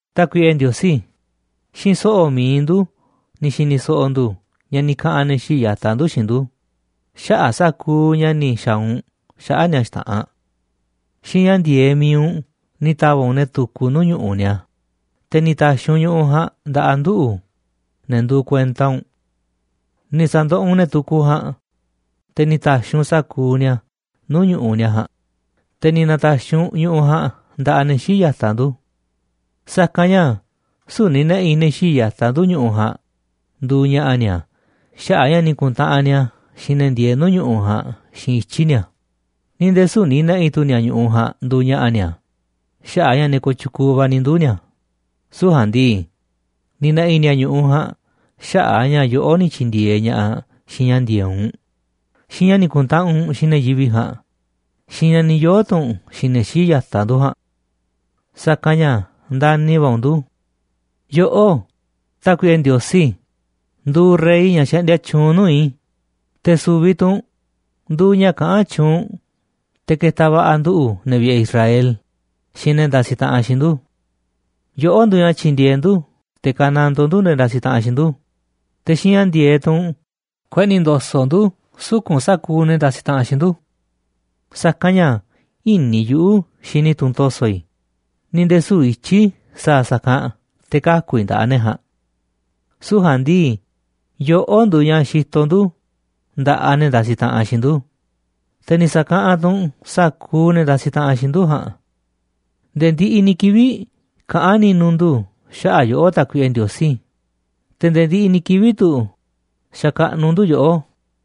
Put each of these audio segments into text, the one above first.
Tákuiꞌe Ndiosí, xiinꞌ so̱ꞌo̱ mi̱iꞌ ndu̱ ni̱ xi̱ni̱ so̱ꞌo̱ ndu̱ ña̱ ni̱ kaꞌa̱n ne̱ xii̱ꞌ ya̱taꞌ ndu̱ xiinꞌ ndu̱ xaꞌa̱ꞌ sa̱kuuꞌ ña̱ ni̱ xa̱a̱ u̱nꞌ xaꞌa̱ꞌ ni̱a̱ xta̱ꞌanꞌ. Xiinꞌ ña̱ ndi̱e̱eꞌ mi̱iꞌ u̱nꞌ ni̱ ta̱va̱ꞌ u̱nꞌ ne̱ tukuꞌ nuu̱ꞌ ñu̱ꞌuꞌ ni̱a̱, te̱ ni̱ na̱ta̱xi̱ u̱nꞌ ñu̱ꞌuꞌ ja̱a̱nꞌ nda̱ꞌaꞌ nduꞌu̱, ne̱ nduuꞌ kuenta u̱nꞌ. Ni̱ sa̱ndoꞌoꞌ u̱nꞌ ne̱ tukuꞌ ja̱a̱nꞌ, te̱ ni̱ ta̱xiꞌ u̱nꞌ sa̱kuuꞌ ni̱a̱ nuu̱ꞌ ñu̱ꞌuꞌ ni̱a̱ ja̱a̱nꞌ, te̱ ni̱ na̱ta̱xi̱ u̱nꞌ ñu̱ꞌuꞌ ja̱a̱nꞌ nda̱ꞌaꞌ ne̱ xii̱ꞌ ya̱taꞌ ndu̱. Sa̱kanꞌ ña̱ süu̱ꞌ ni̱ na̱ꞌi̱ ne̱ xii̱ꞌ ya̱taꞌ ndu̱ ñu̱ꞌuꞌ ja̱a̱nꞌ nduuꞌ ña̱ꞌa̱ ni̱a̱ xaꞌa̱ꞌ a̱ ña̱ ni̱ ku̱ntaꞌanꞌ ni̱a̱ xiinꞌ ne̱ ndieeꞌ nuu̱ꞌ ñu̱ꞌuꞌ ja̱a̱nꞌ xiinꞌ ityi̱ ni̱a̱, ni̱ nde̱e̱ süu̱ꞌ ni̱ na̱ꞌi̱ tu̱ ni̱a̱ ñu̱ꞌuꞌ ja̱a̱nꞌ nduuꞌ ña̱ꞌa̱ ni̱a̱ xaꞌa̱ꞌ a̱ ña̱ ne̱ kooꞌ tyukuuꞌ va̱ ni̱ nduu̱ ni̱a̱. Süu̱ꞌ ja̱a̱nꞌ ndii, ni̱ na̱ꞌi̱ ni̱a̱ ñu̱ꞌuꞌ ja̱a̱nꞌ xaꞌa̱ꞌ a̱ ña̱ yoꞌó ni̱ tyi̱ndi̱e̱eꞌ ña̱ꞌaꞌ xiinꞌ ña̱ ndi̱e̱eꞌ u̱nꞌ, xiinꞌ ña̱ ni̱ ku̱ntaꞌanꞌ u̱nꞌ xiinꞌ ne̱ yivi̱ꞌ ja̱a̱nꞌ, xiinꞌ ña̱ ni̱ yoo̱ tu̱ u̱nꞌ xiinꞌ ne̱ xii̱ꞌ ya̱taꞌ ndu̱ ja̱a̱nꞌ. Sa̱kanꞌ ña̱ ndani̱ va̱ u̱nꞌ ndu̱. Yoꞌó, Tákuiꞌe Ndiosí, nduuꞌ rey ña̱ xaꞌndia tyuunꞌ nuu̱ꞌ i̱, te̱ su̱vi̱ tu̱ u̱nꞌ nduuꞌ ña̱ kaꞌán tyuunꞌ te̱ ketaꞌ va̱ꞌa̱ nduꞌu̱, ne̱ vi̱ꞌe̱ Israel, xiinꞌ ne̱ ndasiꞌ taꞌanꞌ xiinꞌ ndu̱. Yoꞌó nduuꞌ ña̱ tyi̱ndi̱e̱eꞌ ndu̱ te̱ ka̱nandoo ndu̱ ne̱ ndasiꞌ taꞌanꞌ xiinꞌ ndu̱, te̱ xiinꞌ ña̱ ndi̱e̱eꞌ tu̱ u̱nꞌ kueꞌni̱ ndo̱so̱ꞌ ndu̱ suku̱nꞌ sa̱kuuꞌ ne̱ ndasiꞌ taꞌanꞌ xiinꞌ ndu̱. Sa̱kanꞌ ña̱ ï̱ni̱ yuꞌu̱ xini i̱ tunꞌ to̱so̱ i̱, ni̱ nde̱e̱ süu̱ꞌ ityi̱ i̱ sa̱a̱ sa̱kanꞌ te̱ kaku̱ i̱ nda̱ꞌaꞌ ne̱ ja̱a̱nꞌ. Süu̱ꞌ ja̱a̱nꞌ ndii, yoꞌó nduuꞌ ña̱ xitoꞌ ndu̱ nda̱ꞌaꞌ ne̱ ndasiꞌ taꞌanꞌ xiinꞌ ndu̱, te̱ ni̱ sa̱kaꞌanꞌ tu̱ u̱nꞌ sa̱kuuꞌ ne̱ ndasiꞌ taꞌanꞌ xiinꞌ ndu̱ ja̱a̱nꞌ. Nde̱e̱ ndiꞌiꞌ ni̱ kivi̱ꞌ kaꞌán ni̱nu̱ ndu̱ xaꞌa̱ꞌ yoꞌó, Tákuiꞌe Ndiosí, te̱ nde̱e̱ ndiꞌiꞌ ni̱ kivi̱ꞌ tu̱ xakaꞌnuꞌ ndu̱ yoꞌó.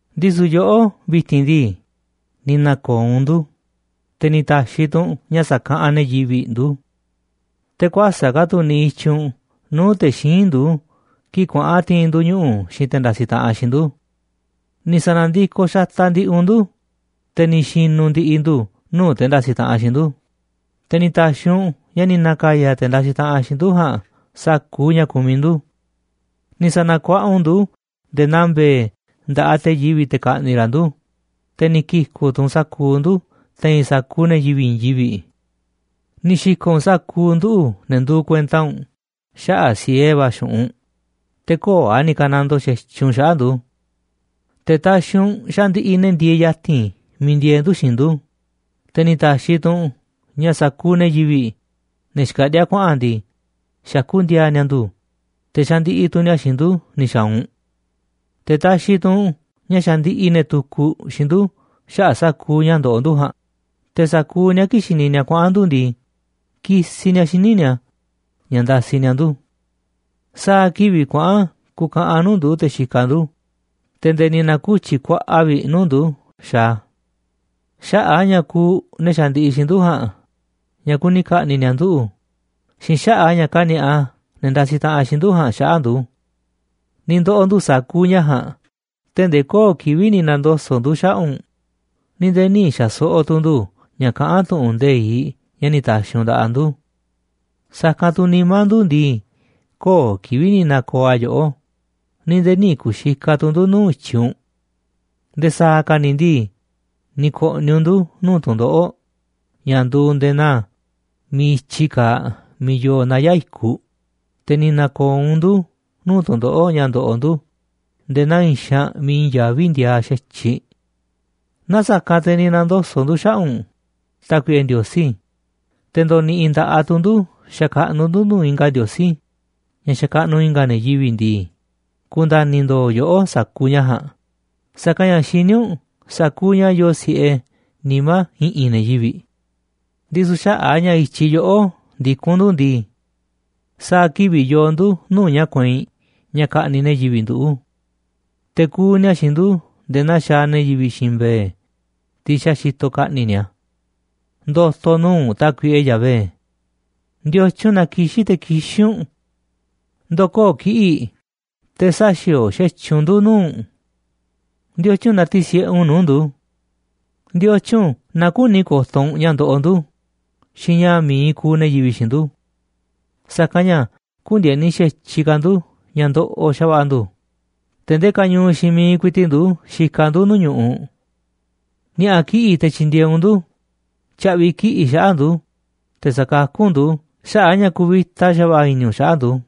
Ndisu̱ yoꞌó vi̱ti̱n ndii, ni̱ na̱ko̱o̱ u̱nꞌ ndu̱, te̱ ni̱ ta̱xi̱ tu̱ u̱nꞌ ña̱ sa̱kaꞌanꞌ ne̱ yivi̱ꞌ ndu̱. Te̱ kuäsa̱ꞌ ka̱ tu̱ niꞌiꞌ i̱tyiꞌ u̱nꞌ nuu̱ꞌ te̱ xíinꞌ ndu̱ kii̱ꞌ kuaꞌa̱n ti̱i̱n ndu̱ ñuꞌu̱ xiinꞌ te̱ ndasiꞌ taꞌanꞌ xiinꞌ ndu̱. Ni̱ sa̱na̱ndikoꞌ xataꞌ ndi̱ꞌi̱ u̱nꞌ ndu̱, te̱ ni̱ xi̱nu̱ ndi̱ꞌi̱ ndu̱ nuu̱ꞌ te̱ ndasiꞌ taꞌanꞌ xiinꞌ ndu̱, te̱ ni̱ ta̱xi̱ u̱nꞌ ña̱ ni̱ na̱ka̱ya̱ te̱ ndasiꞌ taꞌanꞌ xiinꞌ ndu̱ ja̱a̱nꞌ sa̱kuuꞌ ña̱ kumiꞌ ndu̱. Ni̱ sa̱na̱kuaꞌa u̱nꞌ ndu̱ nde̱e̱ naa mbe̱e̱ nda̱ꞌaꞌ te̱ yivi̱ꞌ te̱ ka̱ꞌni̱ꞌ ra̱ ndu̱, te̱ ni̱ ki̱ku̱ꞌ tu̱ u̱nꞌ sa̱kuuꞌ ndu̱ te̱i̱n sa̱kuuꞌ ne̱ yivi̱ꞌ i̱i̱n yivi̱ꞌ. Ni̱ xi̱ko̱ꞌ u̱nꞌ sa̱kuuꞌ nduꞌu̱, ne̱ nduuꞌ kuenta u̱nꞌ, xaꞌa̱ꞌ siee va̱ xu̱ꞌunꞌ, te̱ köo̱ꞌ a̱ ni̱ ka̱nandoo xa̱tyiꞌ u̱nꞌ xaꞌa̱ꞌ ndu̱. Te̱ taxiꞌ u̱nꞌ ña̱ xandiꞌiꞌ ne̱ ndieeꞌ ya̱ti̱n miiꞌ ndieeꞌ ndu̱ xiinꞌ ndu̱, te̱ ni̱ ta̱xi̱ tu̱ u̱nꞌ ña̱ sa̱kuuꞌ ne̱ yivi̱ꞌ, ne̱ xkaꞌndíá kuaꞌa̱n ndii, xakú ndi̱a̱a̱ ni̱a̱ ndu̱, te̱ xandiꞌiꞌ tu̱ ni̱a̱ xiinꞌ ndu̱ ni̱ xa̱a̱ u̱nꞌ. Te̱ taxiꞌ tu̱ u̱nꞌ ña̱ xandiꞌiꞌ ne̱ tukuꞌ xiinꞌ ndu̱ xaꞌa̱ꞌ sa̱kuuꞌ ña̱ ndoꞌoꞌ ndu̱ ja̱a̱nꞌ, te̱ sa̱kuuꞌ ni̱a̱, kii̱ꞌ xini ni̱a̱ kuaꞌa̱n ndu̱ ndii, kisiꞌ ni̱a̱ xíniꞌ ni̱a̱ ña̱ ndasiꞌ ni̱a̱ ndu̱. Sa̱a̱ kivi̱ꞌ kuaꞌa̱n kukaꞌanꞌ nuu̱ꞌ ndu̱ te̱ xikaꞌ ndu̱, te̱ nde̱e̱ ni̱ na̱ku̱tyi̱ kuaꞌa vi̱ꞌ nuu̱ꞌ ndu̱ xaaꞌ a̱. Xaꞌa̱ꞌ a̱ ña̱ kuuꞌ ne̱ xandiꞌiꞌ xiinꞌ ndu̱ ja̱a̱nꞌ ña̱ kuni ka̱ꞌni̱ꞌ ni̱a̱ nduꞌu̱ xiinꞌ xaꞌa̱ꞌ a̱ ña̱ kani̱a̱ꞌa ne̱ ndasiꞌ taꞌanꞌ xiinꞌ ndu̱ ja̱a̱nꞌ xaꞌa̱ꞌ ndu̱. Ni̱ ndo̱ꞌo̱ ndu̱ sa̱kuuꞌ ña̱ ja̱a̱nꞌ tee̱ꞌ ndee köo̱ꞌ kivi̱ꞌ ni̱ na̱ndoso̱ꞌ ndu̱ xaꞌa̱ꞌ u̱nꞌ, ni̱ nde̱e̱ nï̱ xa̱so̱ꞌo̱ tu̱ ndu̱ ña̱ kaꞌán tu̱ꞌu̱n nde̱iꞌ ña̱ ni̱ ta̱xi̱ u̱nꞌ nda̱ꞌaꞌ ndu̱. Sa̱kanꞌ tu̱ nimá ndu̱ ndii, köo̱ꞌ kivi̱ꞌ ni̱ na̱ko̱o̱ a̱ yoꞌó, ni̱ nde̱e̱ nï̱ ku̱xikaꞌ tu̱ ndu̱ nuu̱ꞌ i̱tyiꞌ u̱nꞌ. Nde̱e̱ sa̱a̱ ka̱ ni̱ ndii, ni̱ ko̱ꞌni̱ u̱nꞌ ndu̱ nuu̱ꞌ tu̱ndoꞌo̱ꞌ ña̱ nduuꞌ nde̱e̱ naa miiꞌ i̱tyi kaaꞌ miiꞌ yoo naya̱ꞌ i̱kuꞌ, te̱ ni̱ na̱ko̱o̱ u̱nꞌ ndu̱ nuu̱ꞌ tu̱ndoꞌo̱ꞌ ña̱ nduuꞌ nde̱e̱ naa i̱i̱n xaanꞌ miiꞌ i̱i̱n yaví ndiaaꞌ xa̱tyiꞌ. Naaꞌ sa̱kanꞌ te̱ ni̱ na̱ndoso̱ꞌ ndu̱ xaꞌa̱ꞌ u̱nꞌ, Tákuiꞌe Ndiosí, te̱ ndo̱ni̱ꞌi̱ nda̱ꞌaꞌ tu̱ ndu̱ xakaꞌnuꞌ ndu̱ nuu̱ꞌ i̱nga̱ ndiosí, ña̱ xakaꞌnuꞌ i̱nga̱ ne̱ yivi̱ꞌ ndii, ku̱nda̱ni̱ ndo̱o̱ yoꞌó sa̱kuuꞌ ña̱ ja̱a̱nꞌ, sa̱kanꞌ ña̱ xiní u̱nꞌ sa̱kuuꞌ ña̱ yoo si̱ꞌe nimá i̱ꞌi̱n ne̱ yivi̱ꞌ. Ndisu̱ xaꞌa̱ꞌ a̱ ña̱ i̱tyiꞌ yoꞌó ndikún ndu̱ ndii, sa̱a̱ kivi̱ꞌ yoo ndu̱ nuu̱ꞌ ña̱ kueinꞌ ña̱ ka̱ꞌni̱ꞌ ne̱ yivi̱ꞌ nduꞌu̱. Te̱ kuuꞌ ni̱a̱ xiinꞌ ndu̱ nde̱e̱ naa xaaꞌ ne̱ yivi̱ꞌ xiinꞌ mbe̱e̱, tiꞌ xa̱ xitoꞌ ka̱ꞌni̱ꞌ ni̱a̱. Ndo̱to̱ nuu̱ꞌ u̱nꞌ, Tákuiꞌe Yahvé. ¿Ndiotyun na kixín te̱ kixín u̱nꞌ? Ndo̱koo̱ kiꞌi̱ꞌ te̱ sä̱xi̱o̱o̱ xa̱tyiꞌ u̱nꞌ ndu̱ nuu̱ꞌ u̱nꞌ. ¿Ndiotyun na tisi̱ꞌe u̱nꞌ nuu̱ꞌ ndu̱? ¿Ndiotyun na küni ko̱to̱ u̱nꞌ ña̱ ndoꞌoꞌ ndu̱ xiinꞌ ña̱ mi̱iꞌ kuuꞌ ne̱ yivi̱ꞌ xiinꞌ ndu̱? Sa̱kanꞌ ña̱ kü̱ndi̱e̱ni xa̱tyiꞌ ka̱ ndu̱ ña̱ ndoꞌoꞌ xa̱va̱ꞌa̱ ndu̱, te̱ ndee kañuuꞌ xiinꞌ miiꞌ ku̱i̱ti̱ꞌ ndu̱ xikaꞌ ndu̱ nuu̱ꞌ ñu̱ꞌuꞌ. Ni̱a̱ꞌa̱ kiꞌi̱ꞌ te̱ tyi̱ndi̱e̱eꞌ u̱nꞌ ndu̱, tya̱ꞌvi̱ kiꞌi̱ꞌ xaꞌa̱ꞌ ndu̱, te̱ sa̱kakú u̱nꞌ ndu̱ xaꞌa̱ꞌ a̱ ña̱ kuvita xa̱va̱ꞌa̱ i̱ni̱ u̱nꞌ xaꞌa̱ꞌ ndu̱.